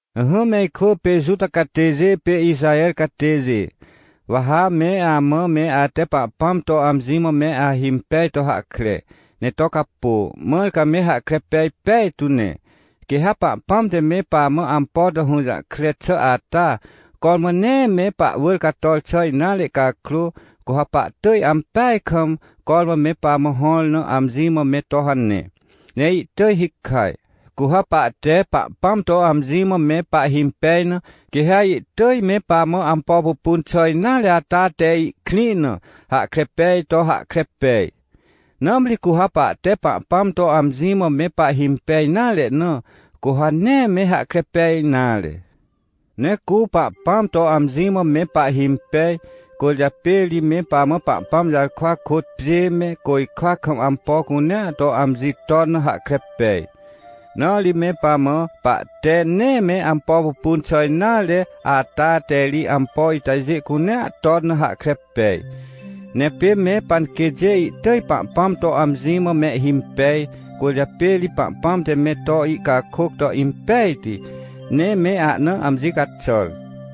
Ỹhỹ me ikwỳ pê Juta catêjê pê Ixaher catêjê, wa ha me amã me ate Pahpãm to amji mã me ahimpej to hahkre, ne to capô, mãr ca me hahkre pej pejtu ne. Quê ha Pahpãm te me pamã ampo to hũjahkre xà ata, cormã nee me pahwỳr cator xà nare cakrô, cu ha pahtỳj ampeaj kam, cormã me pamã hõr na amji mã me to hane, ne pahtỳj me hikaj. Cu ha pahte Pahpãm to amji mã me pahhimpej na, quê ha ihtỳj me pamã ampo pupun xà nare ata te ihkrĩ na hahkre peaj to hahkre pej. Nãmri cu ha pahte Pahpãm to amji mã me pahhimpej nare na, cu ha nee me hahkre pej nare. Ne cu Pahpãm to amji mã me pahhimpej, cwỳrjapê ri me pamã Pahpãm jarkwa kôt pjê me côjkwa kam ampo cunea te amji ton na hahkre pej. Na ri me pamã, pahte nee me ampo pupun xà nare ata te ri ampo itajê cunea ton na hahkre pej. Ne pê me panquêtjê ihtỳj Pahpãm to amji mã mehhimpej, cwỳrjapê ri Pahpãm te me to ihcakôc to impejti, ne me ahna amji caxàr.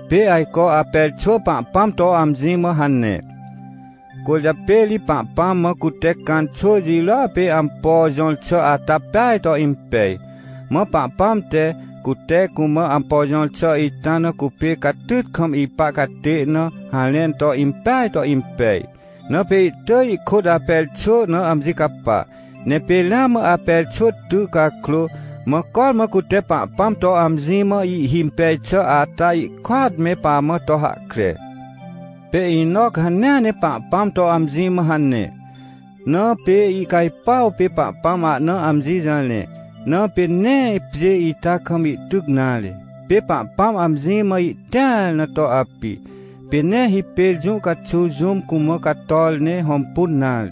Pê ajco Aper xwỳ Pahpãm to amji mã hane, cwỳrjapê ri Pahpãm mã cute Cãn xwỳ jirôa pê ampo jõr xà ata peaj to impej. Mã Pahpãm te, cute cumã ampo jõr xà ita na cupê catyt kam ipa catê na harẽn to impeaj to impej. Na pê ihtỳj ihkôt Aper xwỳ na amji capa. Ne pê ramã Aper xwỳ ty cakrô, mã cormã cute Pahpãm to amji mã ihhimpej xà ata, ihkôat me pamã to hahkre. Pê Enoc hanea ne Pahpãm to amji mã hane, na pê ihcajpuaw pê Pahpãm ahna amji jarẽ, na pê nee pjê ita kam ihtyc nare, pê Pahpãm amji mã ihtĩar na to api, pê nee hipêr jũ caxuw jũm cumã cator ne hõmpun nare.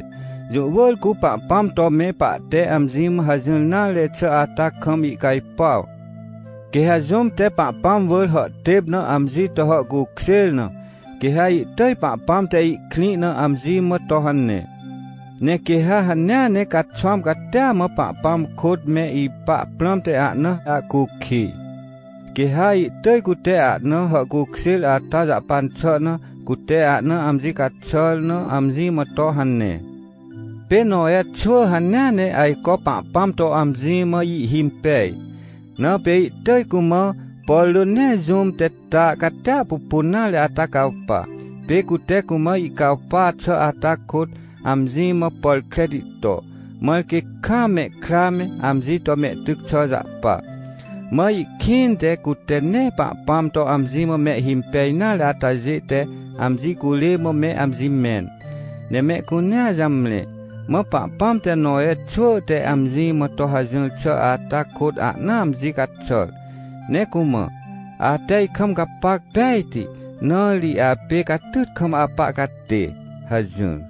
Jũ wỳr cu Pahpãm to me pahte amji mã hajỹr nare xà ata kam ihcajpuaw. Quê ha jũm te Pahpãm wỳr hàhtêp na amji to hàhcukjêr na, quê ha ihtỳj Pahpãm te ihkrĩ na amji mã to hane. Ne quê ha hanea ne caxwãm catia mã Pahpãm kôt me ipa prãmte ahna ahcukij, quê ha ihtỳj cute ahna hàhcukjêr ata jahpan xà na, cute ahna amji caxàr na amji mã to hane. Pê Nowe xwỳ hanea ne ajco Pahpãm to amji mã ihhimpej, na pê ihtỳj cumã, por rỳ nee jũm te ta catia pupun nare ata cawpa. Pê cute cumã ihcawpa xà ata kôt, amji mã pàr kreti to, mãr quê kaam mehkra me, amji to mehtyc xà jahpa. Mã ihkĩnte cute nee Pahpãm to amji mã mehhimpej nare atajê te amji curê mã me amji mẽn, ne mehcunea jamre. Mã Pahpãm te Nowe xwỳ te amji mã to hajỹr xà ata kôt ahna amji caxàr, ne cumã: — Ate ikam gapac pejti, na ri apê catyt kam apa catê — hajỹr.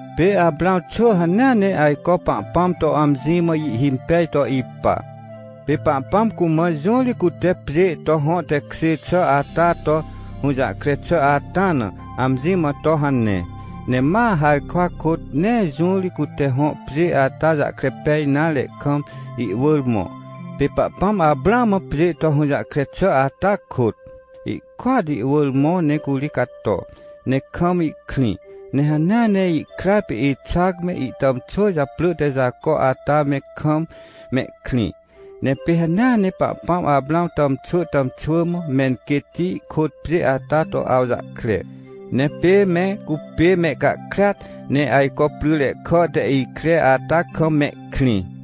Pê Aprãw xwỳ hanea ne ajco Pahpãm to amji mã ihhimpej to ipa, pê Pahpãm cumã jũ ri cute pjê to hõ tekjê xà ata to, hũjahkre xà ata na, amji mã to hane. Ne ma harkwa kôt, nee jũ ri cute hõ pjê ata jahkre pej nare kam, ihwỳr mõ. Pê Pahpãm Aprãw mã pjê to hũjahkre xà ata kôt, ihkôat ihwỳr mõ ne curi cato, ne kam ihkrĩ. Ne hanea ne ihkra pê Ixac me, ihtàmxwỳ japrỳ te Jaco ata me, kam mehkrĩ. Ne pê hanea ne Pahpãm Aprãw tàmxwỳ tàmxwỳ mã, menquêtti kôt pjê ata to awjahkre. Ne pê me cupê mehcahkriat, ne ajco pryre kà te ikre ata kam mehkrĩ.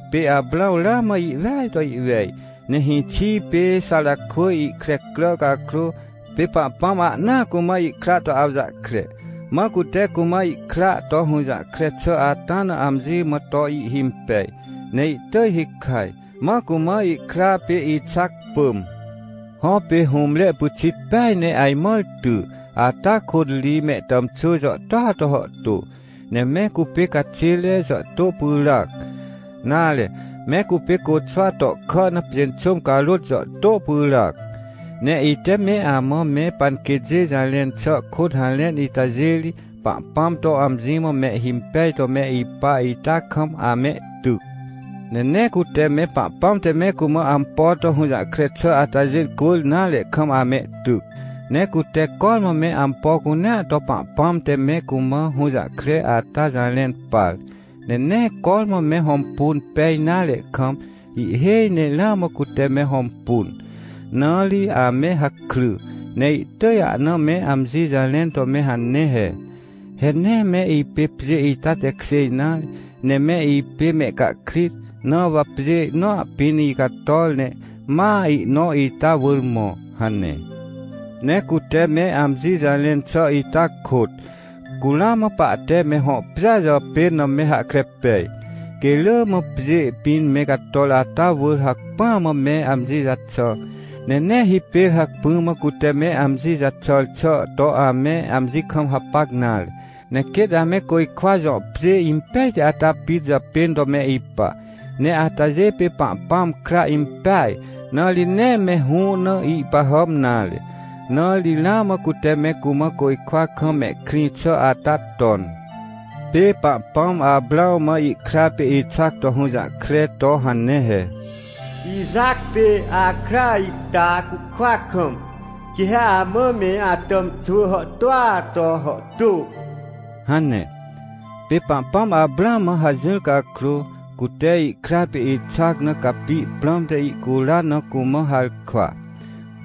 Pê Aprãw ramã ihweaj to ihwej, ne hĩxi pê Xarakwỳj ihkre crà cakrô, pê Pahpãm ahnaa cumã ihkra to awjahkre. Mã cute cumã ihkra to hũjahkre xà ata na amji mã to ihhimpej, ne ihtỳj hikaj, mã cumã ihkra pê Ixac pỳm. Hõ, pê hũmre pyxit peaj ne ajmãr ty, ata kôt ri mehtàmxwỳ jàhtôa to hàhtô, ne me cupê caxêre jàhtô pyràac, nare, me cupê côxwa tohkà na pjênxôm carôt jàhtô pyràac. Ne ite me amã me panquêtjê jarẽn xà kôt harẽn itajê ri, Pahpãm to amji mã mehhimpej to me ipa ita kam amehtyc. Ne nee cute me Pahpãm te me cumã ampo to hũjahkre xà atajê cwỳr nare kam amehtyc. Ne cute cormã me ampo cunea to Pahpãm te me cumã hũjahkre ata jarẽn par, ne nee cormã me hõmpun pej nare kam, ihhêj ne ramã cute me hõmpun, na ri ame hakry, ne ihtỳj ahna me amji jarẽn to me hane he: — He nee me ipê pjê ita tekjê nare, ne me ipê mehcahkrit, na wa pjê nõa pĩn icator, ne ma ihnõ ita wỳr mõ — hane. Ne cute me amji jarẽn xà ita kôt, cu ramã pahte me hõ pjêa japên na me hahkre pej. Quê rỳ mã pjê pĩn me cator ata wỳr hacpỹa mã me amji jaxà, ne nee hipêr hacpỹ mã cute me amji jaxàr xà to ame amji kam hapac nare. Ne quêt ame côjkwa jõ pjê impejti ata pit japên to me ipa. Ne atajê pê Pahpãm kra impeaj, na ri nee me hũ na ihpahàm nare. Na ri ramã cute me cumã côjkwa kam mehkrĩ xà ata ton. Pê Pahpãm Aprãw mã ihkra pê Ixac to hũjahkre to hane he: — Ixac pê akra ita cucwa kam, quê ha amã me atàmxwỳ hàhtôa to hàhtô — hane. Pê Pahpãm Aprãw mã hajỹr cakrô, cute ihkra pê Ixac na capi prãmte ihcuran na cumã harkwa.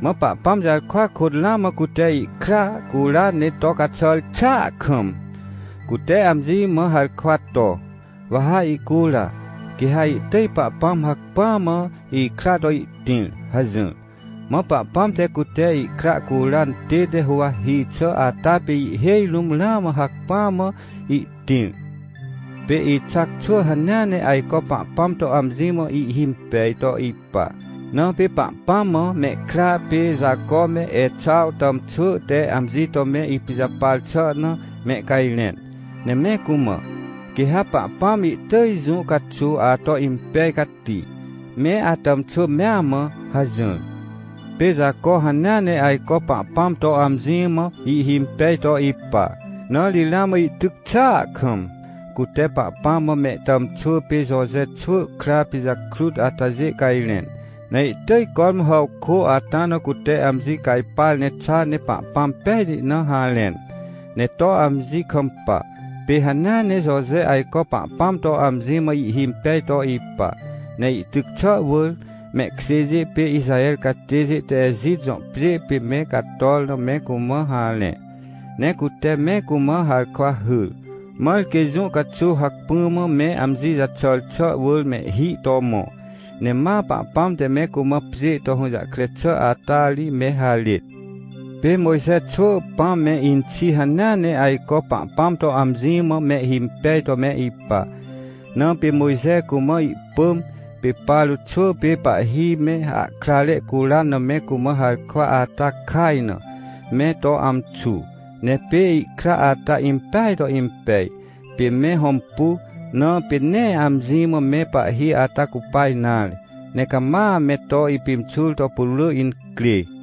Mã Pahpãm jarkwa kôt ramã cute ihkra curan ne to caxàr xàa kam, cute amji mã harkwa to: — Wa ha ihcura, quê ha ihtỳj Pahpãm hacpỹa mã ikra to ihtĩr — hajỹr. Mã Pahpãm te cute ihkra curan tête huwahi xà ata pê ihhêj rũm ramã hacpỹa mã ihtĩr. Pê Ixac xwỳ hanea ne ajco Pahpãm to amji mã ihhimpej to ipa, na pê Pahpãm mã mehkra pê Jaco me Exaw tàmxwỳ te amji to me ipijapar xà na mehcajrẽn, ne me cumã: — Quê ha Pahpãm ihtỳj jũ caxuw ato impej cati, me atàmxwỳ mea mã — hajỹr. Pê Jaco hanea ne ajco Pahpãm to amji mã ihhimpej to ipa, na ri ramã ihtyc xàa kam, cute Pahpãm mã mehtàmxwỳ pê Joje xwỳ kra pijakrut atajê cajrẽn, ne ihtỳj cormã hàwkô ata na cute amji cajpar ne xa ne Pahpãm pejti na harẽn, ne to amji kampa. Pê hanea ne Joje ajco Pahpãm to amji mã ihhimpej to ipa, ne ihtyc xà wỳr, mehkjêjê pê Ixaher catêjê te Ejit jõ pjê pê me cator na me cumã harẽ. Ne cute me cumã harkwa hyr, mãr quê jũ caxuw hacpỹ mã me amji jaxàr xà wỳr mehhi to mõ, ne ma Pahpãm te me cumã pjê to hũjahkre xà ata ri me harêt. Pê Mojxe xwỳ pãm me inxi hanea ne ajco Pahpãm to amji mã mehhimpej to me ipa. Na pê Mojxe cumã ihpỳm, pê Paro xwỳ pê pahhi me ahkrare curan na me cumã harkwa ata kaj na, me to amxu. Ne pê ihkra ata impeaj to impej, pê me hõmpu, na pê nee amji mã me pahhi ata cupa nare, ne cama me to ipimxur to putwrỳ incrê.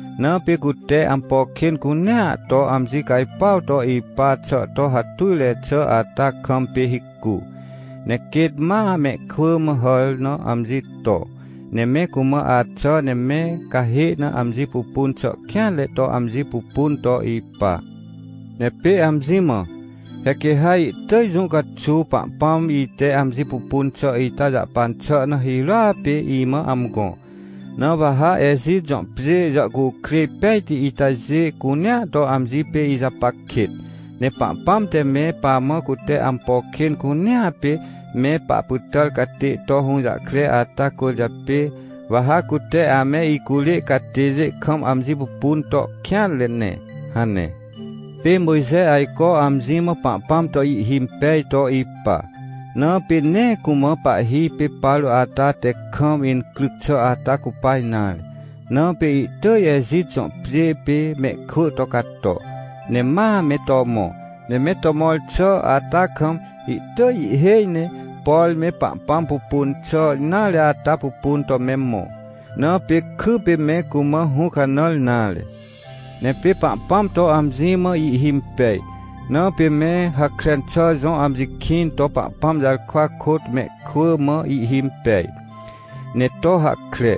Na pê cute ampo kên cunea to amji cajpuaw to ipa xà to hatujre xà ata kam pê hicu, ne quêt ma mehkwỳ mã hàr na amji to. Ne me cumã axà ne me cahê na amji pupun xà kêanre to amji pupun to ipa. Ne pê amji mã: — He quê ha ihtỳj jũ caxuw Pahpãm ite amji pupun xà ita jahpan xà na hirôa pê imã amgõ. Na wa ha Ejit jõ pjê jàhcukrêj pejti itajê cunea to amji pê ijapac kêt. Ne Pahpãm te me pamã cute ampo kên cunea pê me pahpytàr catê to hũjahkre ata cwỳrjapê, wa ha cute ame icurê catêjê kam amji pupun to kêanre ne — hane. Pê Mojxe ajco amji mã Pahpãm to ihhimpej to ipa, na pê nee cumã pahhi pê Paro ata te kam incryc xà ata cupa nare, na pê ihtỳj Ejit jõ pjê pê mehkwỳ to cato, ne ma me to mõ. Ne me to mõr xà ata kam, ihtỳj ihhêj ne, por me Pahpãm pupun xà nare ata pupun to me mõ. Na pê kypê me cumã hũcanãr nare. Ne pê Pahpãm to amji mã ihhimpej, na pê me Hakren xà jõ amji kĩn to Pahpãm jarkwa kôt mehkwỳ mã ihhimpej, ne to hahkre.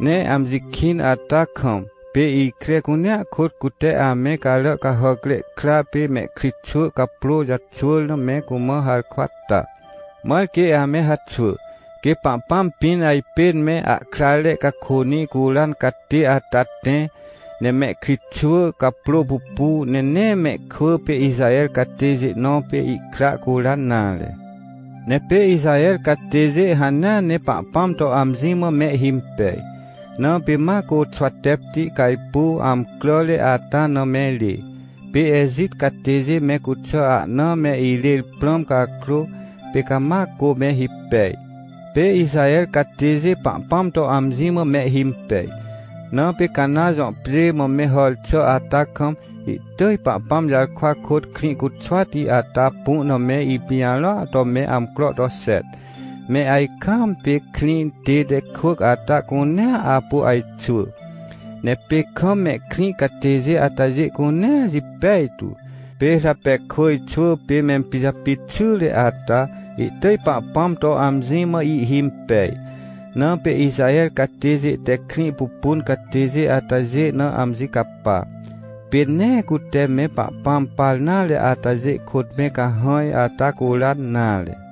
Ne amji kĩn ata kam, pê ikre cunea kôt cute ame carà cahàcre kra pê mehkritxwỳ caprô jaxwỳr na me cumã harkwa ta. Mãr quê ame haxwỳ, quê Pahpãm pĩn ajpên me ahkrare cakônĩ curan catê ata tẽ, ne mehkritxwỳ caprô pupu, ne nee mehkwỳ pê Ixaher catêjê nõ pê ihkra curan nare. Ne pê Ixaher catêjê hanea ne Pahpãm to amji mã mehhimpej, na pê ma Côxwatepti cajpuw amcràre ata na me rê. Pê Ejit catêjê me cuxà ahna me irêr prãm cakrô, pê cama cô me hipej. Pê Ixaher catêjê Pahpãm to amji mã mehhimpej, na pê Cana jõ pjê mã me hàr xà ata kam, ihtỳj Pahpãm jarkwa kôt Krĩcuxwati ata pu na me ipijarõa to me amcro to xet, me ajkaam pê krĩ tête kwỳc ata cunea apu ajxwỳ, ne pê kam mehkrĩ catêjê atajê cunea jipej tu. Pê Rapekwỳj xwỳ pê mempijapit xyre ata, ihtỳj Pahpãm to amji mã ihhimpej, na pê Ixaher catêjê te krĩ pupun catêjê atajê na amji capa, pê nee cute me Pahpãm par nare atajê kôt me cahãj ata curan nare.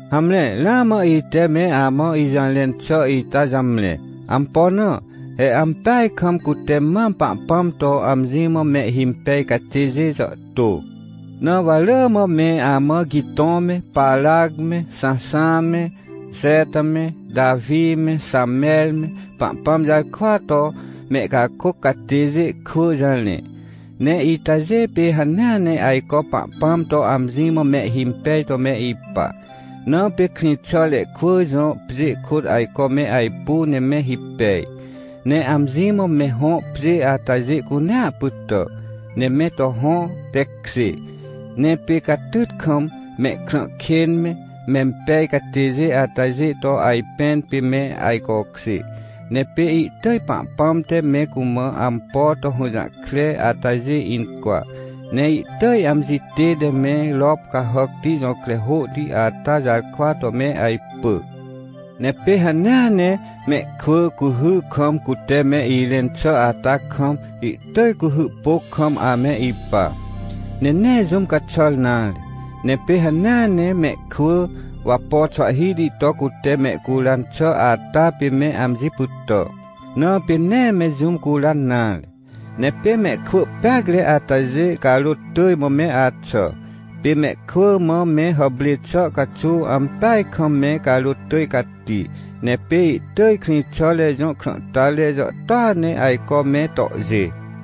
Hamre ramã ite me amã ijũjarẽn xà ita jamre. Ampo na? He ampeaj kam cute mam Pahpãm to amji mã mehhimpej catêjê jàhtô, na wa rỳ mã me amã Gitõ me, Parac me, Xãnxã me, Jeta me, Tawi me, Xamer me, Pahpãm jarkwa to mehcakôc catêjê kwỳ jarẽ. Ne itajê pê hanea ne ajco Pahpãm to amji mã mehhimpej to me ipa, na pê krĩxàre kwỳ jõ pjê kôt ajco me ajpu ne me hipej, ne amji mã me hõ pjê atajê cunea pytà, ne me to hõ tekjê. Ne pê catyt kam, mehkrã kên me, mempej catêjê atajê to ajpẽn pê me ajcokjê. Ne pê ihtỳj Pahpãm te me cumã ampo to hũjahkre atajê incwa, ne ihtỳj amji tête me rop cahàcti jõkre hôhti ata jarkwa to me ajpỳ. Ne pê hanea ne mehkwỳ, cuhy kam cute me irẽn xà ata kam, ihtỳj cuhy pôc kam ame ipa, ne nee jũm caxàr nare. Ne pê hanea ne mehkwỳ, wapo xwahhihti to cute mehcuran xà ata pê me amji pytà, na pê nee me jũm curan nare. Ne pê mehkwỳ peacre atajê, carôt tỳj mã me axà. Pê mehkwỳ mã me hàprê xà caxuw ampeaj kam me carôt tỳj cati, ne pê ihtỳj krĩxàre jõ krãhtare jàhtôa ne ajco me tohjê.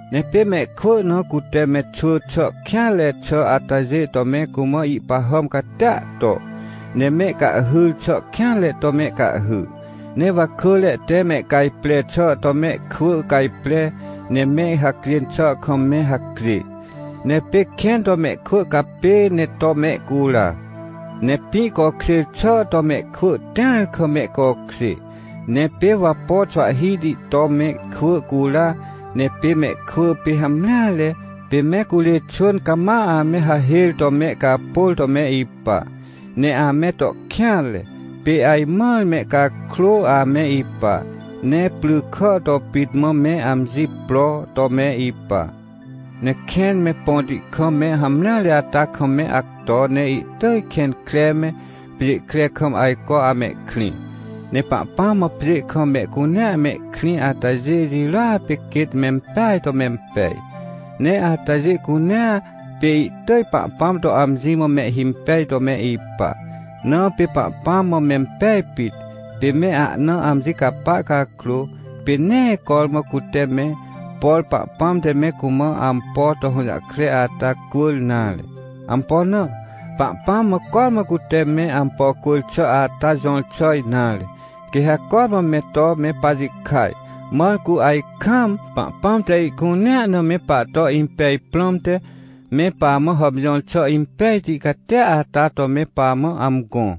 Ne pê mehkwỳ na cute me xwỳ xà kêanre xà atajê to me cumã ihpahàm catia to, ne mehcahhyr xà kêanre to mehcahhy. Ne wakỳre te mehcajpre xà to mehkwỳ cajpre, ne me hacjên xà kam me hacjê. Ne pê kẽn to mehkwỳ capê ne to mehcura. Ne pĩ cokjêr xà to mehkwỳ tĩar kam mehcokjê. Ne pê wapo xwahhihti to mehkwỳ cura. Ne pê mehkwỳ pê hamreare, pê me curê xwỳn cama ame hahêr to mehcapôr to me ipa, ne ame to kêanre, pê ajmãr mehcakrô ame ipa, ne prykà to pit mã me amji pro to me ipa. Ne kẽn me põti kam me hamreare ata kam me acto ne ihtỳj kẽn kre me, pjê kre kam ajco amehkrĩ. Ne Pahpãm mã pjê kam mehcunea mehkrĩ atajê jirôa pê quêt mempeaj to mempej. Ne atajê cunea, pê ihtỳj Pahpãm to amji mã mehhimpej to me ipa, na pê Pahpãm mã mempej pit, pê me ahna amji capa cakrô, pê nee cormã cute me, por Pahpãm te me cumã ampo to hũjahkre ata cwỳr nare. Ampo na? Pahpãm mã cormã cute me ampo cwỳr xà ata jõr xà nare, quê ha cormã me to me pajikaj, mãr cu ajkaam, Pahpãm te ihcunea na me pahto impej prãmte me pamã hàmjõr xà impejti catia ata to me pamã amgõ.